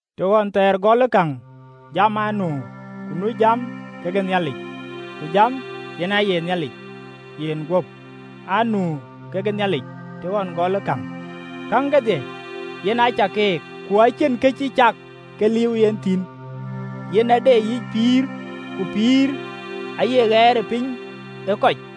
Të ɣɔn thɛɛr gɔlë käŋ Jam aa nu, ku nu Jam kekë Nhialic, ku Jam yen aye Nhialic. Yen guöp aa nu ke Nhialic të ɣɔn gɔlë käŋ. Käŋ kedhie yen aa cak keek, ku acïn kë cï cak ke liiu yen thïn. Yen aa de yic pïïr, ku pïïrë aaye ɣɛɛrëpiny ë kɔc.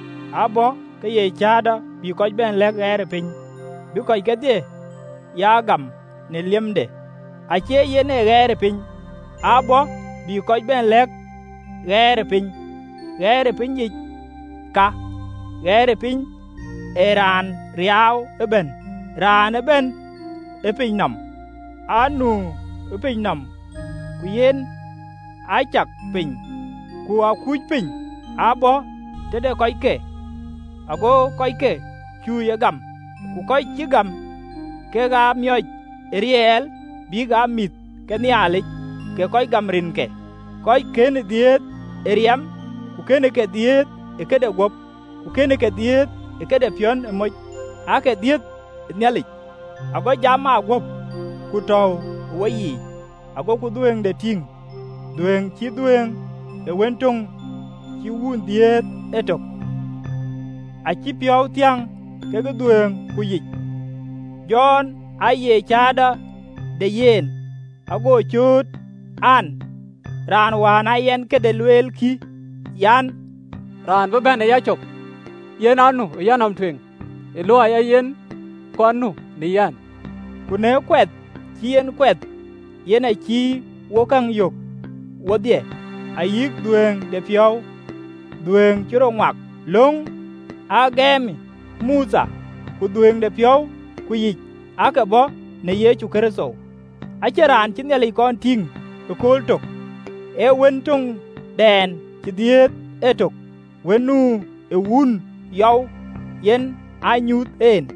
Aa bɔ̈ ke ye cäätɔ, bï kɔc bɛ̈n lɛ̈k ɣɛɛrëpiny, bï kɔc kedhie ya gam në liemde. Acie yen ee ɣɛɛrëpiny, aa bɔ̈ bï kɔc bɛ̈n lɛ̈k ɣɛɛrëpiny. Ɣɛɛrëpiny yic ka, ɣɛɛrëpiny ë raan riaau ëbɛ̈n, raan ëbɛ̈n ë piny nɔm. Aa nu ë piny nɔm, ku yen aa cak piny, ku aa kuc piny. Aa bɔ̈ tëde kɔcke, ago kɔcke ye cuö gam. Ku kɔc cï gam, kek aa miɔc ë riɛl bïk aa mïth ke Nhialic, kek kɔc gam rinke: Kɔc kënë dhiëëth ë riɛm, ku kënëke dhiëëth ë këde guöp, ku kënë ke dhiëëth ë këde piɔ̈n ë moc, aake dhiëëth Nhialic. Ago Jam aa guöp, ku tɔ̈u ë woyiic (agoku dhuëëŋde tïŋ dhuëëŋ cït dhuëëŋ ë Wën töŋ cïï Wun dhiëëth etök), acï piɔ̈u thiäŋ ke dhuëëŋ ku yic. Jɔn aaye cäätɔ de yen, ago cööt an, “Raan wään aa yɛn këde lueel kï, an, ‘Raan bï bɛ̈n ë yacök, yen anu ë yanɔm tueŋ: ë luɔi ee yen ë kɔn nu në yɛn.”’ Ku në kuɛth cï en kuɛth yen acï wok käŋ yök wodhie, ayï dhuëëŋdepiɔ̈u dhuëëŋ cï rɔt ŋuak. Löŋ aa gëmë Mothe, ku dhuëëŋdepiɔ̈u ku yic aake bɔ̈ në Yecu Kërtho. Acïn raan cï Nhialic kɔn tïŋ ëkööl tök, ee Wën töŋdɛn cï dhiëëth etök, Wën nu ë Wun yɔu, yen aa nyuuth en.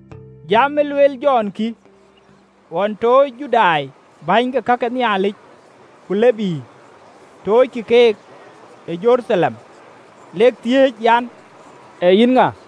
Jam ë lueel Jɔn kï, ɣɔn toocë Judai bäny ke ka ke Nhialic ku Lebii, toockï keek Jeruthalem lek thiëëc an, “Ee yïn ŋa?”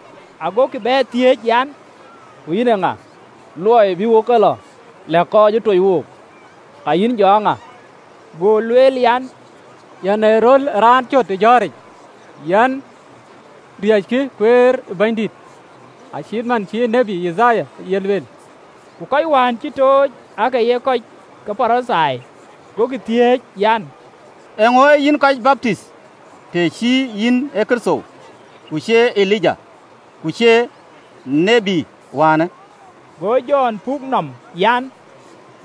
Agokï bɛ thiëëc an, “Ku ee yïn ŋa? Luɔi bï wok e lɔ lɛ̈k kɔc ë toc wook. Ka yïn, jɔ aa ŋa?” (LXX). Go lueel an, “Yɛn ee röl ë raan cöt ë jɔ̈ɔ̈ric, Riëckï kueer ë Bɛ̈nydït, acït man cï ë tiët Yithaya ye lueel.” Ku kɔc wään cï tooc aake ye kɔc ke Parithai. Agokï thiëëc an, “Eeŋö ee yïn kɔc baptith, të cïï yïn ë Kërtho, ku cïï ye Elija, ku cïï ye tiët wäänë?” Go Jɔn puk nɔm an,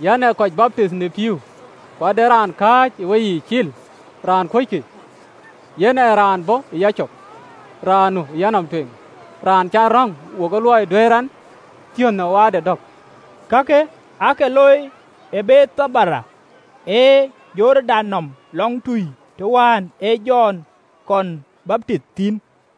“Yɛn ee kɔc baptith në pïïu: ku ade raan kääc ë weyiic cil, raan kuöckï, yen ee raan bɔ̈ ë yacök, raan nu ë yanɔm tueŋ, raan cän röŋ wokë luɔi duɛ̈ɛ̈r ɛn thiön ë waarde dɔ̈k.” Kakë aake loi ë Bethani ë Jordan nɔm lɔŋtui, të wään ee Jɔn kɔn baptith thïn.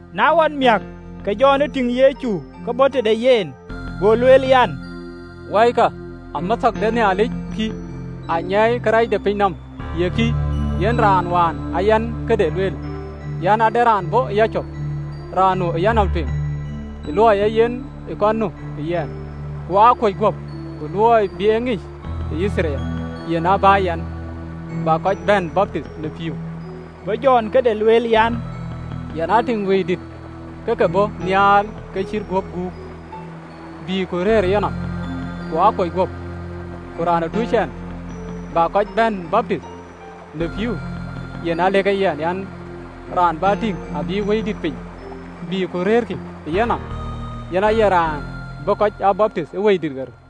Na ɣɔn amiäk, ke Jɔn tïŋ Yecu ke bɔ̈ tëde yen, go lueel an, “Wɔikï, Amɛthɔ̈k de Nhialic kï, anyiɛɛi kërɛɛc de piny nɔm! Ye kï, yen raan wään aa yɛn këde lueel an, ‘Ade raan bɔ̈ ë yacök, raan nu ë yanɔm tueŋ, ë luɔi ee yen ë kɔn nu ë yɛn.’ Ku aa kuöc guöp, ku luɔi bï e ŋic ë Yithriɛl, yen aa bä yɛn, bä kɔc bɛ̈n baptith në pïïu.” Go Jɔn këde lueel an, “Yɛn aa tïŋ Wëidït ke ke bɔ̈ nhial ke cït guöp guuk, bï ku rëër ë yenɔm. Ku aa kuöc guöp: ku raan ë toc ɛn bä kɔc bɛ̈n baptith në pïïu, yen aa lëk e yɛn an, ‘Raan bä tïŋ abï Wëidït piny bïk ku rëërkï ë yenɔm, yen aye raan bï kɔc aa baptith ë Wëidït ɣer.’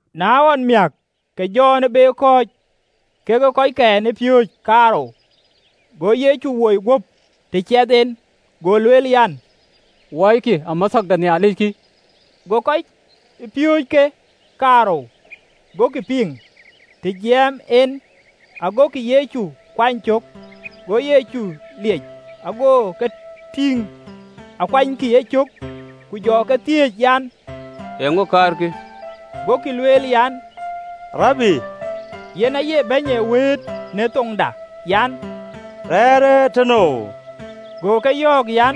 Na ɣɔn amiäk, ke Jɔn be kɔ̈ɔ̈c kekë kɔckɛn ë piööcë kaarou, go Yecu woi guöp të ciɛth en, go lueel an, “Wɔikï Amɛthɔ̈k de Nhialic kï!” Go kɔc piööcë kë kaarou gokï piŋ, të jiɛɛm en, agokï Yecu kuany cök. Go Yecu liec, ago ke tïŋ akuanykï e cök, ku jɔ ke thiëëc an, “Eeŋö kaarkï?” Gokï lueel an, “Rabi (yen aye Bɛ̈ny ë wëët, në thoŋda) an, “Rɛ̈ɛ̈rë tënou?” Go ke yɔ̈ɔ̈k an,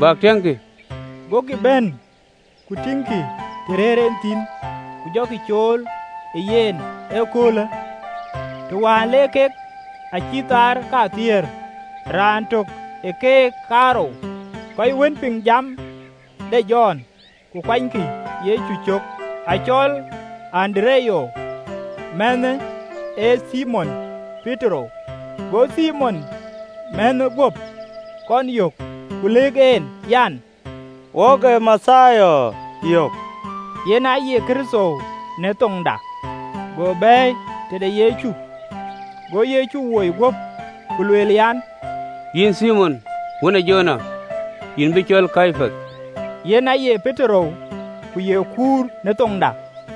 “Bäk tiëŋkï.” Gokï bɛ̈n ku tïŋkï të rëër en thïn, ku jɔkï cool ë yen ëköölë: të wään le kek aa cït thaar kathiëër. Raan tök ë keek kaarou, kɔc wën piŋ jam de Jɔn ku kuanykï Yecu cök, acɔl Andereya, mänhë ë Thimon Petero. Go Thimon mänhë guöp kɔn yök, ku lëk en, an, “Wok ë Mathia yök (yen aye Kërtho, në thoŋda). Go bɛ̈ɛ̈i tëde Yecu. Go Yecu woi guöp, ku lueel an, “Yïn Thimon, wën ë Jona: yïn bï cɔɔl Kepath.” (Yen aye Petero, ku ye “kuur” në thoŋda.)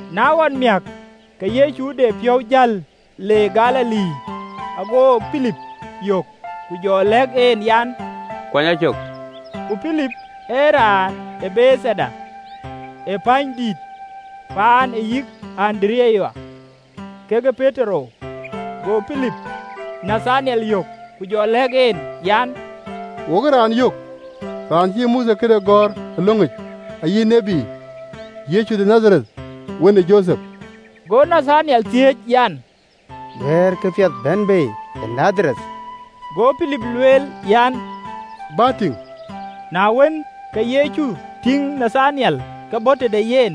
Na ɣɔn amiäk, ke Yecu de piɔ̈u jäl le Galili, ago Pilip yök: ku jɔ lɛ̈k en an, “Kuany a cök.” Ku Pilip ee raan ë Bethaida, ee pänydït, paan ë yï Andereya kekë Petero. Go Pilip Nathanyel yök, ku jɔ lɛ̈k en an, “Wok ë raan yök, raan cï Mothe këde gɔ̈ɔ̈r ë löŋic, ayï tït, Yecu de Nadhareth, wën ë Jothep.” Go Nathanyel thiëëc an, “Duëër kapiɛth bɛ̈n bei ë Nadhareth?” Go Pilip lueel an, “Bä tïŋ.” Na wën, ke Yecu tïŋ Nathanyel ke bɔ̈ tëde yen,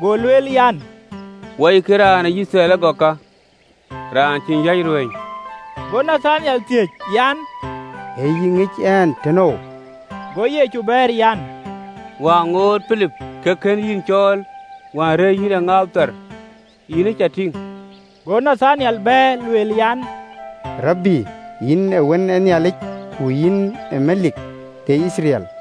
go lueel an, “Wɔikï, raan ë Yithriɛl ëgɔk ka, raan cïn yäc ruëëny!” Go Nathanyel thiëëc an, “Ë yï ŋic ɛn tënou?” Go Yecu bɛ̈ɛ̈r an, “Wään ŋoot Pilip ke kën yïn cɔɔl, wään rëër yïn ë ŋaap thar, yïn ë cä tïŋ.” Go Nathanyel bɛ̈ɛ̈r, lueel an, “Rabi, yïn ee Wën ë Nhialic! Ku yïn ee Melik de Yithriɛl!”